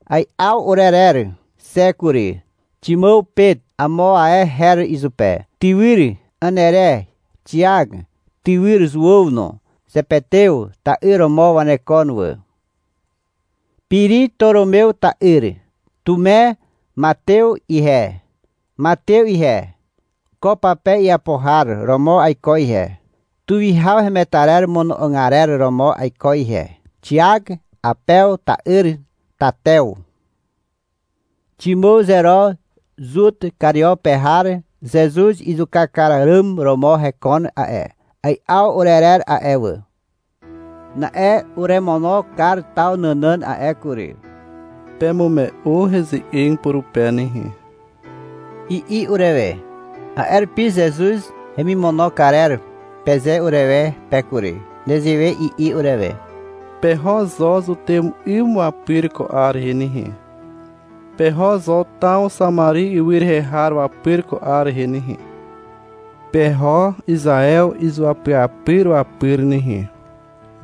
Ai'aw urerer xe kury. Ximàw (Pet amo ae her izupe), tywyr Anere, Xiak, tywyr Zuàw no. Zepetew ta'yr romo wanekon wà. Piri, Toromew ta'yr, Tume, Matew (Ihe Matew ihe, ko pape iapo har romo aiko ihe, tuwihaw hemetarer mono'og arer romo aiko ihe), Xiak Awpew ta'yr, Tatew. Ximàw Zero, Zut Kario pe har (Zezuz izuka kar àràm romo hekon a'e). Ai'aw urerer a'e wà. Na'e uremono kar taw nànàn a'e kury. — Pemume'u heze'eg purupe nehe, i'i urewe. (A'e rupi — Zezuz hemimono karer, peze urewe pe kury). Nezewe i'i urewe. Peho zo zutew 'ym wapyr ko 'ar rehe nehe. Peho zo taw Xamari ywy rehe har wapyr ko 'ar rehe nehe. Peho Izaew izuapyapyr wapyr nehe,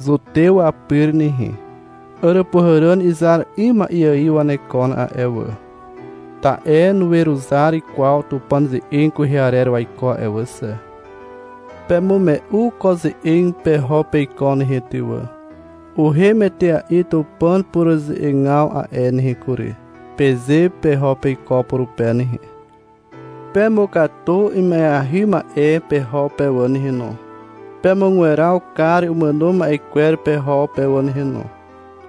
zutew wapyr nehe. Àràpuhàràn izar 'ym ma'e ài wanekon a'e wà, ta'e nuweruzar kwaw Tupàn ze'eg kwehe arer waiko a'e wà xe. Pemume'u ko ze'eg peho peiko nehe ty wà. Uhem etea'i Tupàn pureruze'egaw a'e nehe kury, peze peho peiko purupe nehe. — Pemukatu ima'eahy ma'e peho pe wà nehe no. Pemugweraw kar umàno ma'e kwer peho pe wà nehe no.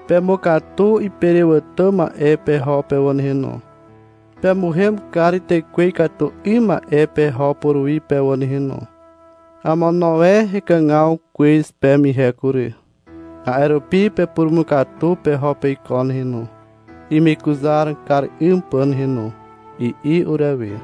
Pemukatu iperewàtà ma'e peho pe wà nehe no. Pemuhem kar tekwe ikatu 'ym ma'e peho puruwi pe wà nehe no. Amono e hekàgaw kwez peme ihe kury. A'e rupi pepurumukatu e peho peiko nehe no, imekuzar kar 'ym pà nehe no, i'i urewe.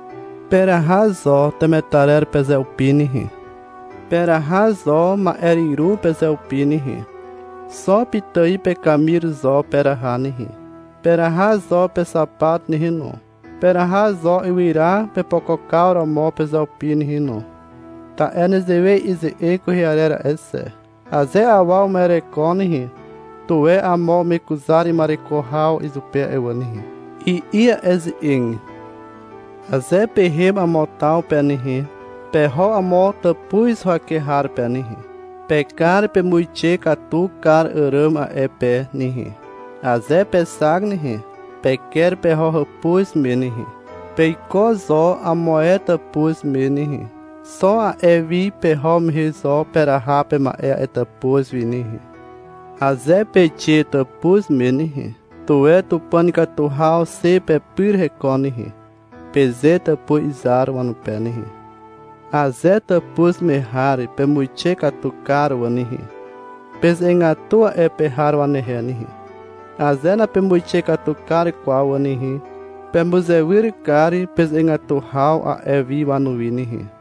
Peraha zo temetarer pezeupi nehe. Peraha zo ma'eryru pezeupi nehe. Xo pitài pekamir zo peraha nehe. Peraha zo pexapat nehe no. Peraha zo ywyra pepokokaw romo pezeupi nehe no. Ta'e nezewe i'i ze'eg kwehe arer a'e xe. — Aze awa uma'ereko nehe, tuwe amo umekuzar ima'ereko haw izupe a'e wà nehe, i'i a'e ze'eg. Aze pehem amo taw pe nehe, peho amo tàpuz huwake har pe nehe. Pekar pemuixe katu kar àràm a'e pe nehe. Aze pexak nehe, peker peho hàpuz me nehe. Peiko zo amo ae hàpuz me nehe. Xo a'e wi peho mehe zo peraha pema'e a'e tàpuz wi nehe. Aze peixe tàpuz me nehe, — Tuwe Tupàn ikatu haw xe pepyr hekon nehe, peze tàpuz izar wanupe nehe. Aze tàpuz me har pemuixe katu kar wà nehe, peze'egatu a'e pe har wanehe nehe. Aze napemuixe katu kar kwaw wà nehe, pemuzewyr kar peze'egatu haw a'e wi wanuwi nehe.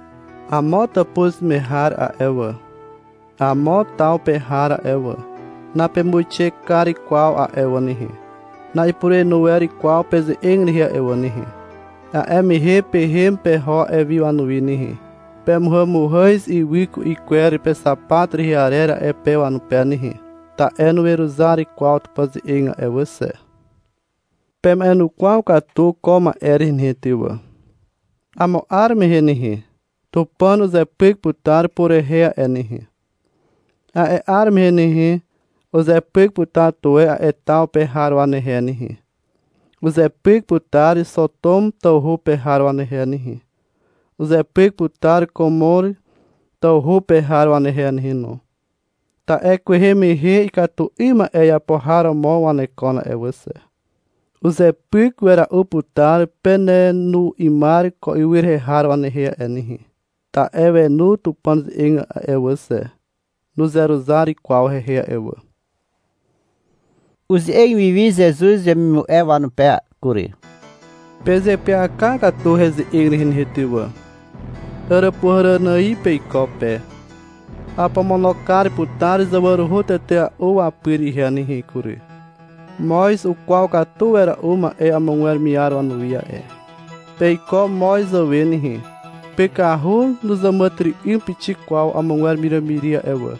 Amo tàpuz me har a'e wà, amo taw pe har a'e wà, napemuixe kar kwaw a'e wà nehe, na'ipurenu wer kwaw peze'eg rehe a'e wà nehe. A'e mehe pehem peho a'e wi wanuwi nehe. Pemuhàmuhàz ywy ku'i kwer pexapat rehe arer a'e pe wanupe nehe. (Ta'e nuweruzar kwaw Tupàn ze'eg a'e wà xe.) Pema'enukwaw katu ko ma'e rehe nehe ty wà. Amo 'ar mehe nehe, Tupàn uzepyk putar purehe a'e nehe. A'e 'ar mehe nehe, uzepyk putar tuwe a'e taw pe har wanehe nehe. Uzepyk putar Xotom tawhu pe har wanehe nehe. Uzepyk putar Komor tawhu pe har wanehe nehe no, ta'e kwehe mehe ikatu 'ym ma'e iapo har romo wanekon a'e wà xe. Uzepyk wera'u putar penenu 'ymar ko ywy rehe har wanehe a'e nehe. (Ta'e wenu Tupàn ze'eg a'e wà xe, nuzeruzar kwaw hehe a'e wà). (Uze'eg wi wi Zezuz wemimu'e wanupe kury.) — Pezeapyaka katu heze'eg rehe nehe ty wà. Àràpuhàràn ài peiko pe. Apomono kar putar zawaruhu tetea'u wapyr ihe nehe kury. Moz ukwaw katu wera'u ma'e amogwer miar wanuwi a'e. Peiko moz zàwe nehe. Pykahu nuzàmàtyry'ym pixik kwaw amogwer wiràmiri a'e wà.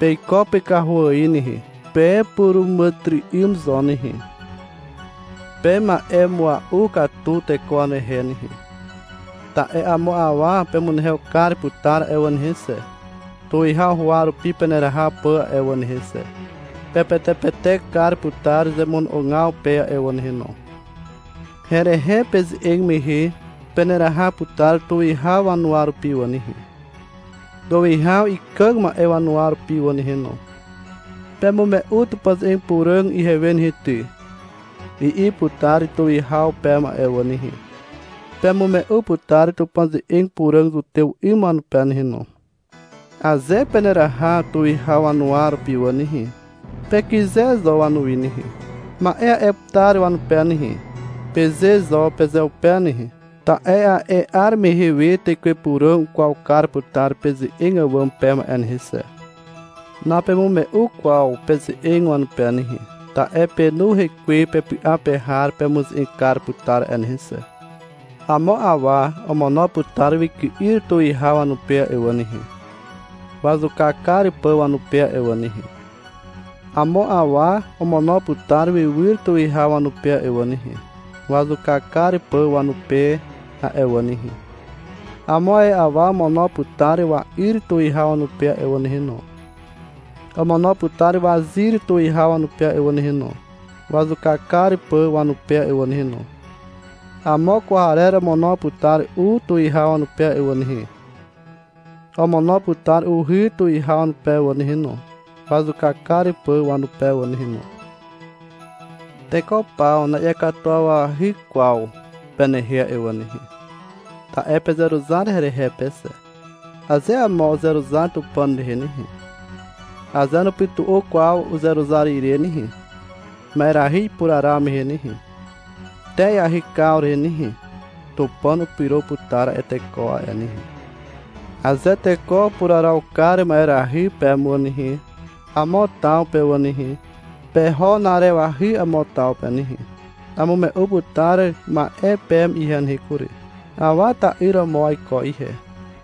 Peiko pykahu ài nehe. Pepuràmàtyry'ym zo nehe. Pema'emua'u katu teko wanehe nehe. Ta'e amo awa pemunehew kar putar a'e wà nehe xe, tuwihaw huwa rupi peneraha pà a'e wà nehe xe. Pepetepetek kar putar zemono'ogaw pe a'e wà nehe no. Herehe peze'eg mehe peneraha putar tuwihaw wanuwa rupi wà nehe, tuwihaw ikàg ma'e wanuwa rupi wà nehe no — Pemume'u Tupàn ze'eg puràg ihewe nehe ty, i'i putar tuwihaw peme a'e wà nehe. Pemume'u putar Tupàn ze'eg puràg zutew 'ym wanupe nehe no. Aze peneraha tuwihaw wanuwa rupi wà nehe, pekyze zo wanuwi nehe. — Ma'e a'e putar wanupe nehe, peze zo pezeupe nehe. Ta'e a'e 'ar mehe we Tekwe Puràg ukwaw kar putar peze'eg àwàm peme a'e nehe xe. Napemume'u kwaw peze'eg wanupe nehe. Ta'e Penu Hekwe pepy'a pe har pemuze'eg kar putar a'e nehe xe. Amo awa omono putar wyky'yr tuwihaw wanupe a'e wà nehe, wazuka kar pà wanupe a'e wà nehe. Amo awa omono putar wywyr tuwihaw wanupe a'e wà nehe, wazuka kar pà wanupe a'e wà nehe. Amo ae awa omono putar wa'yr tuwihaw wanupe a'e wà nehe no, omono putar wazyr tuwihaw wanupe a'e wà nehe no, wazuka kar pà wanupe a'e wà nehe no. Amo kwarer omono putar u tuwihaw wanupe a'e wà nehe, omono putar uhy tuwihaw wanupe wà nehe no, wazuka kar pà wanupe wà nehe no. Teko paw na'iakatuwawahy kwaw penehe a'e wà nehe, ta'e pezeruzar herehe pe xe. Aze amo uzeruzar Tupàn rehe nehe, aze nupytu'u kwaw uzeruzar ire nehe, ma'erahy ipuraraw mehe nehe, te iahykaw rehe nehe, Tupàn upyro putar a'e teko a'e nehe. Aze teko upuraraw kar ma'erahy peme wà nehe, amo taw pe wà nehe, peho na'arewahy amo taw pe nehe. Amume'u putar ma'e peme ihe nehe kury. Awa ta'yr romo aiko ihe.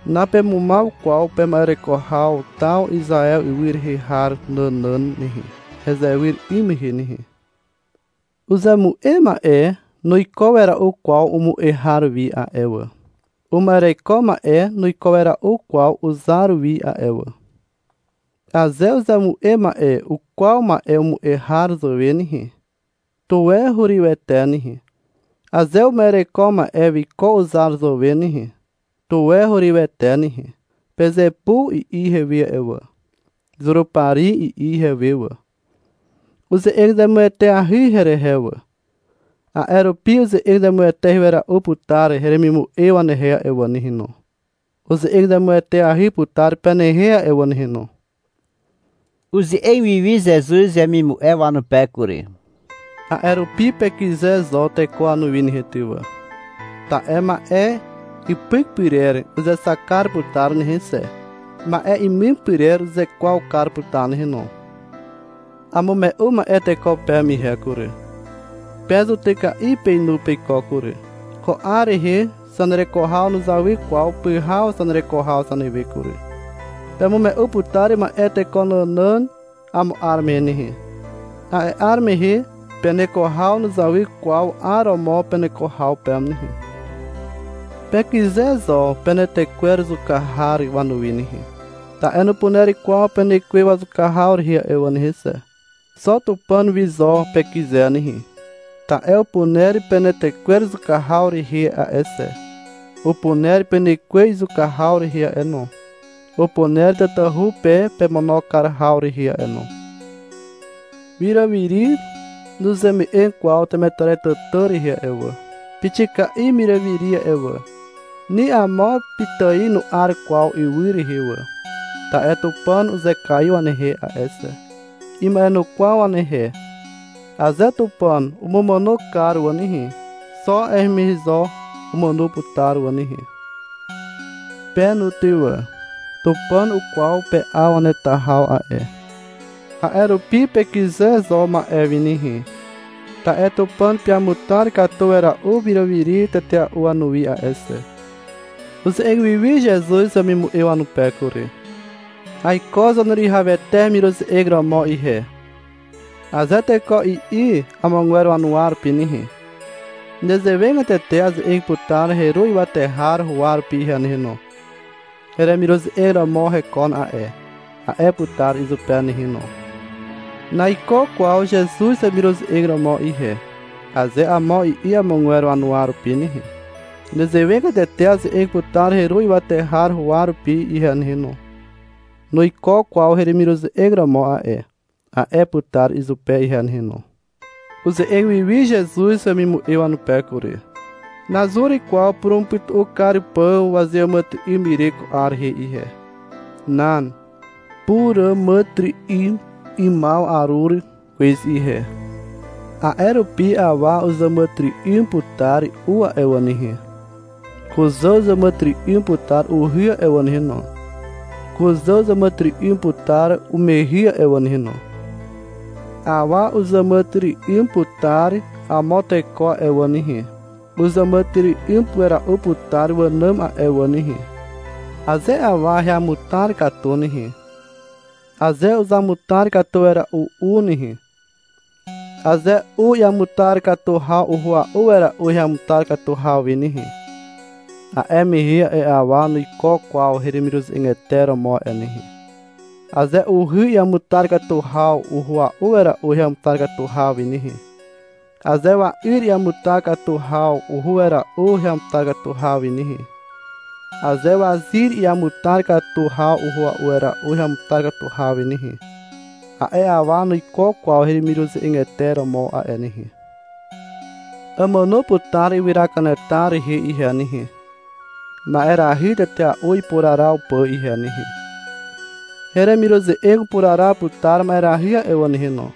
Napemumaw kwaw pema'ereko haw taw Izaew ywy rehe har nànàn nehe, hezewyr 'ym mehe nehe. Uzemu'e ma'e nuiko wera'u kwaw umu'e har wi a'e wà. Uma'ereko ma'e nuiko wera'u kwaw uzar wi a'e wà. Aze uzemu'e ma'e ukwaw ma'e umu'e har zàwe nehe, tuwe hurywete nehe. Aze uma'ereko ma'e wiko uzar zàwe nehe, tuwe hurywete nehe. — Pezepu, i'i ihewe a'e wà. (— Zurupari, i'i ihewe wà.) Uze'eg zemueteahy herehe wà. A'e rupi uze'eg zemueteahy wera'u putar heremimu'e wanehe a'e wà nehe no. Uze'eg zemueteahy putar penehe a'e wà nehe no. (Uze'eg wi wi Zezuz wemimu'e wanupe kury.) — A'e rupi pekyze zo teko wanuwi nehe ty wà. Ta'e ma'e ipyk pyrer uzexak kar putar nehe xe, ma'e imim pyrer uzekwaw kar putar nehe no. Amume'u ma'e teko peme ihe kury. Pe zutyka'i peinu peiko kury. Ko 'ar rehe zanereko haw nuzawy kwaw pyhaw zanereko haw zanewe kury. Pemume'u putar ma'e teko nànàn amo 'ar mehe nehe. A'e 'ar mehe peneko haw nuzawy kwaw 'ar romo peneko haw peme nehe. Pekyze zo penetekwer zuka har wanuwi nehe, ta'e nupuner kwaw penekwe wazuka haw rehe a'e wà nehe xe. Xo Tupàn wi zo pekyze nehe. Ta'e upuner penetekwer izuka haw rehe a'e xe. Upuner penekwe izuka haw rehe a'e no. Upuner tatahu pe pemono kar haw rehe a'e no. Wiràmiri nuzeme'eg kwaw temetarer tàtà rehe a'e wà. Pixika'i wiràmiri a'e wà. Ni amo pitài nu'ar kwaw ywy rehe wà. Ta'e Tupàn uzekaiw wanehe a'e xe. Ima'enukwaw wanehe. Aze Tupàn umumàno kar wà nehe, xo a'e mehe zo umàno putar wà nehe. Pe no ty wà. Tupàn ukwaw pe'aw waneta haw a'e. A'e rupi pekyze zo ma'e wi nehe. Ta'e Tupàn peamutar katu wera'u wiràmiri tetea'u wanuwi a'e xe. (Uze'eg wi wi Zezuz wemimu'e wanupe kury.) — Aiko Zaneruwihawete hemiruze'eg romo ihe, aze teko i'i amogwer wanuwa rupi nehe, nezewegatete aze'eg putar Heru ywate har huwa rupi ihe nehe no. — Heremiruze'eg romo hekon a'e, a'e putar izupe nehe no. — Naiko kwaw Zezuz hemiruze'eg romo ihe, aze amo i'i amogwer wanuwa rupi nehe, nezewegatete aze'eg putar Heru ywate har huwa rupi ihe nehe no. — Nuiko kwaw heremiruze'eg romo a'e, a'e putar izupe ihe nehe no. (Uze'eg wi wi Zezuz wemimu'e wanupe kury.) — Nazur kwaw purumupytu'u kar pà wazeàmàtyry'ym ire ko 'ar rehe ihe. Nan. Puràmàtyry'ymaw arur kwez ihe. A'e rupi awa uzàmàtyry'ym putar u a'e wà nehe. Kuzà uzàmàtyry'ym putar uhy a'e wà nehe no. Kuzà uzàmàtyry'ym putar umehy a'e wà nehe no. Awa uzàmàtyry'ym putar amo teko a'e wà nehe. Uzàmàtyry'ym wera'u putar wànàm a'e wà nehe. Aze awa heamutar katu nehe, aze uzamutar katu wera'u u nehe, aze u iamutar katu haw uhua'u wera'u heamutar katu haw wi nehe, a'e mehe a'e awa nuiko kwaw heremiruze'egete romo a'e nehe. Aze uhy iamutar katu haw uhua'u wera'u heamutar katu haw wi nehe, aze wa'yr iamutar katu haw uhua'u wera'u heamutar katu haw wi nehe, aze wazyr iamutar katu haw uhua'u wera'u heamutar katu haw wi nehe, a'e awa nuiko kwaw heremiruze'egete romo a'e nehe. Amàno putar ywyra kanetar rehe ihe nehe, ma'erahy tetea'u ipuraraw pà ihe nehe. Heremiruze'eg upuraraw putar ma'erahy a'e wà nehe no.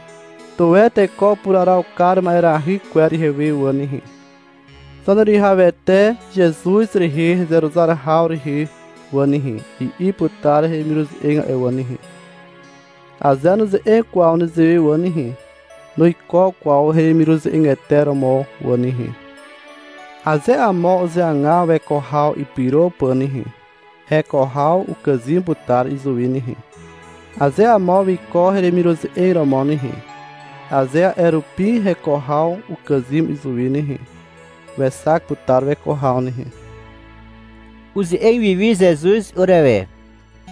— Tuwe teko upuraraw kar ma'erahy kwer ihewe wà nehe, Zaneruwihawete Zezuz rehe hezeruzar haw rehe wà nehe, i'i putar heremiruze'eg a'e wà nehe. Aze nuze'eg kwaw nezewe wà nehe, nuiko kwaw heremiruze'egete romo wà nehe. Aze amo uzeagaw weko haw ipyro pà nehe, heko haw ukàzym putar izuwi nehe. Aze amo wiko heremiruze'eg romo nehe, aze a'e rupi heko haw ukàzym izuwi nehe, wexak putar weko haw nehe. (Uze'eg wiwi Zezuz urewe.)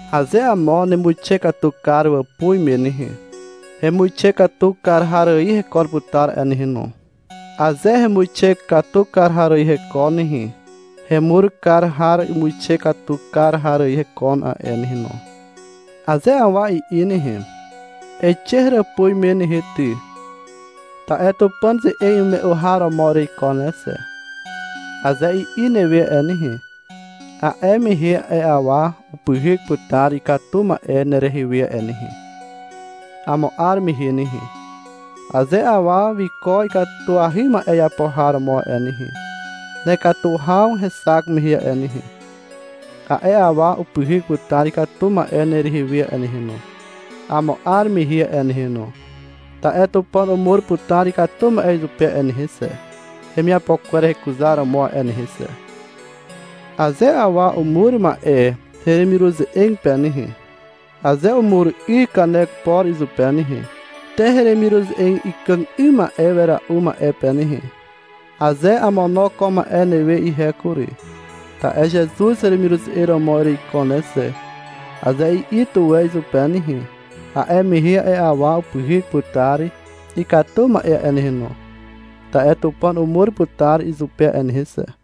— Aze amo nemuixe katu kar wàpuz me nehe, hemuixe katu kar har ài hekon putar a'e nehe no. Aze hemuixe katu kar har ài hekon nehe, hemur kar har imuixe katu kar har ài hekon a'e nehe no. Aze awa i'i nehe, — Eixe heràpuz me nehe ty, ta'e Tupàn ze'eg imume'u har romo ereiko ne xe, aze i'i newe a'e nehe, a'e mehe a'e awa upyhyk putar ikatu ma'e nerehe we a'e nehe, amo 'ar mehe nehe. Aze awa wiko ikatuahy ma'e iapo har romo a'e nehe, nekatu haw hexak mehe a'e nehe, a'e awa upyhyk putar ikatu ma'e nerehe we a'e nehe no, amo 'ar mehe a'e nehe no, ta'e Tupàn umur putar ikatu ma'e izupe a'e nehe xe, hemiapo kwer hekuzaromo a'e nehe xe. Aze awa umur ma'e heremiruze'eg pe nehe, aze umur 'y kanek por izupe nehe, te heremiruze'eg ikàg 'ym wera'u ma'e pe nehe, aze — Amono ko ma'e newe ihe kury, ta'e Zezuz hemiruze'eg romo ereiko ne xe, aze i'i tuwe izupe nehe, a'e mehe a'e awa upyhyk putar ikatu ma'e a'e nehe no, ta'e Tupàn umur putar izupe a'e nehe xe.